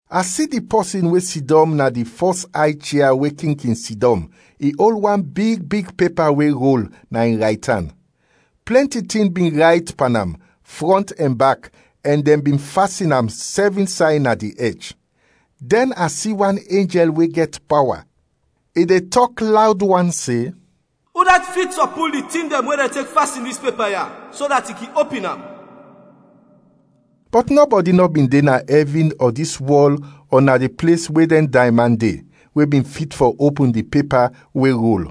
A si di Pɔsin we sidɔm na di fɔs ay chia we king kin sidɔm, i ol wan big big pepa we rol, na in raytan. Plɛnti tin bin rayt pan am, frɔnt ɛn bak, ɛn dɛn bin fasin am sɛvin say na di ɛj. Dɛn a si wan enjɛl we gɛt pawa, i de tɔk lawd wan se, “Udat fit fɔ pul di tin dɛn we dɛn tek fasin dis pepa ya so dat i kin opin am?” Bɔt nɔbɔdi nɔ bin de na ɛvin ɔ dis wɔl ɔ na di ples we dɛn dayman de, we bin fit fɔ opin di pepa we rol,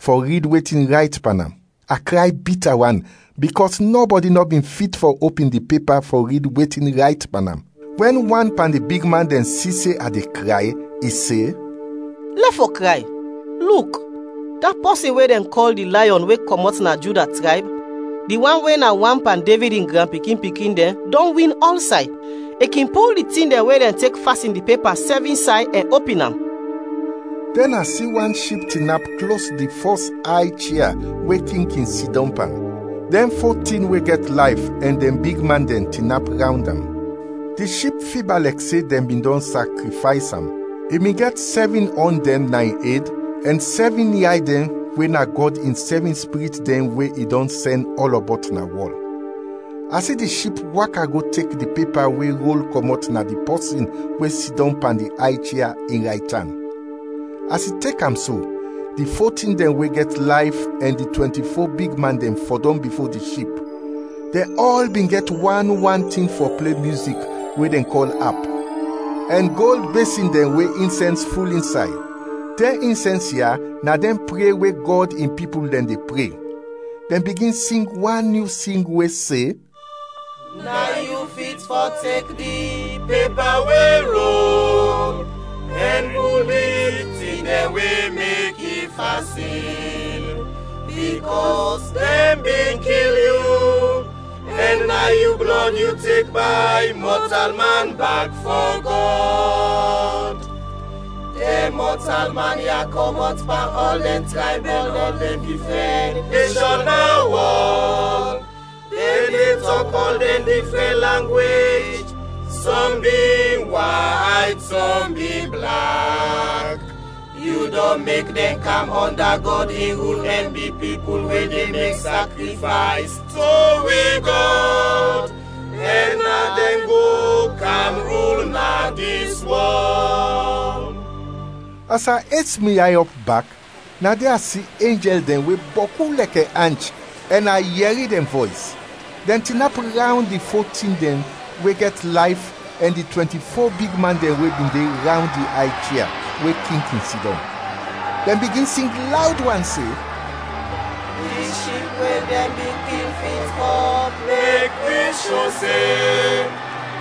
fɔ rid wetin rayt pan am. A kray bita wan bikɔs nɔbɔdi nɔ bin fit fɔ opin di pepa fɔ rid wetin rayt pan am. Wɛn wan pan di bigman dɛn si se a de kray, i se, “Lɛf fɔ kray; luk, da pɔsin we dɛn kɔl di Layɔn we kɔmɔt na Juda trayb, di wan we na wan pan Devid in granpikin-pikin dɛn, dɔn win ɔlsay. I kin pul di tin dɛn we dɛn tek fasin di pepa sɛvin say ɛn opin am.” Dɛn a si wan Ship tinap klos di fɔs ay chia we king kin sidɔm pan, dɛn fo tin we gɛt layf ɛn dɛn bigman dɛn tinap rawnd am. Di Ship fiba lɛkɛ se dɛn bin dɔn sakrifays am. I bin gɛt sɛvin ɔn dɛn na in ed ɛn sɛvin yay dɛn we na Gɔd in sɛvin Spirit dɛn we i dɔn sɛn ɔlɔbɔt na wɔl. A si di Ship waka go tek di pepa we rol kɔmɔt na di Pɔsin we sidɔm pan di ay chia, in raytan. As i tek am so, di fo tin dɛn we gɛt layf ɛn di twɛnti-fo bigman dɛn fɔdɔm bifo di Ship. Dɛn ɔl bin gɛt wan wan tin fɔ ple myuzik we dɛn kɔl ap, ɛn gold besin dɛn we insɛns ful insay; dɛn insɛns ya na dɛn pre we Gɔd in pipul dɛn de pre. Dɛn bigin sing wan nyu sing we se, “Na yu fit fɔ tek di pepa we rol ɛn pul di tin dɛn we mek i fasin. Bikɔs dɛn bin kil yu, ɛn na yu blɔd yu tek bay mɔtalman bak fɔ Gɔd; dɛn mɔtalman ya kɔmɔt pan ɔl dɛn trayb ɛn ɔl dɛn difrɛn neshɔn na wɔl, dɛn de tɔk ɔl dɛn difrɛn langwej, sɔm bin wayt, sɔm bin blak. Yu dɔn mek dɛn kam ɔnda Gɔd in rul ɛn bi pipul we de mek sakrifays to wi Gɔd, ɛn na dɛn go kam rul na dis wɔl.” As a es mi yay ɔp bak, na de a si enjɛl dɛn we bɔku lɛkɛ anch ɛn a yɛri dɛn vɔys! Dɛn tinap rawnd di fo tin dɛn we gɛt layf ɛn di twɛnti-fo bigman dɛn we bin de rawnd di ay chia we king kin sidɔm. Dɛn bigin sing lawd wan se, “Di Ship we dɛn bin kil, fit fɔ mek wi sho se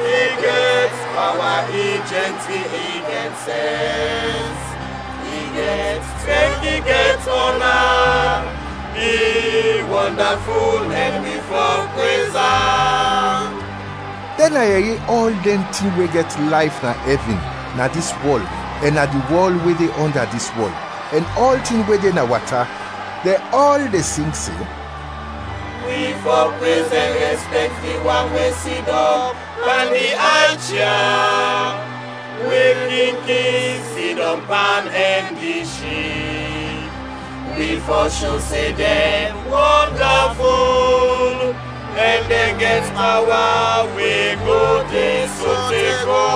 i gɛt pawa, i jɛntri, i gɛt sɛns, i gɛt trɛnk, i gɛt ɔna, i wɔndaful, ɛn wi fɔ prez am.” Dɛn a yɛri ɔl dɛn tin we gɛt layf na ɛvin, na dis wɔl ɛn na di wɔl we de ɔnda dis wɔl, ɛn ɔltin we de na wata, dɛn ɔl de sing se, “Wi fɔ prez ɛn rɛspɛkt di wan we sidɔm pan di ay chia we king kin sidɔm pan ɛn di Ship, wi fɔ sho se dɛn wɔndaful ɛn dɛn gɛt pawa we go de sote go!”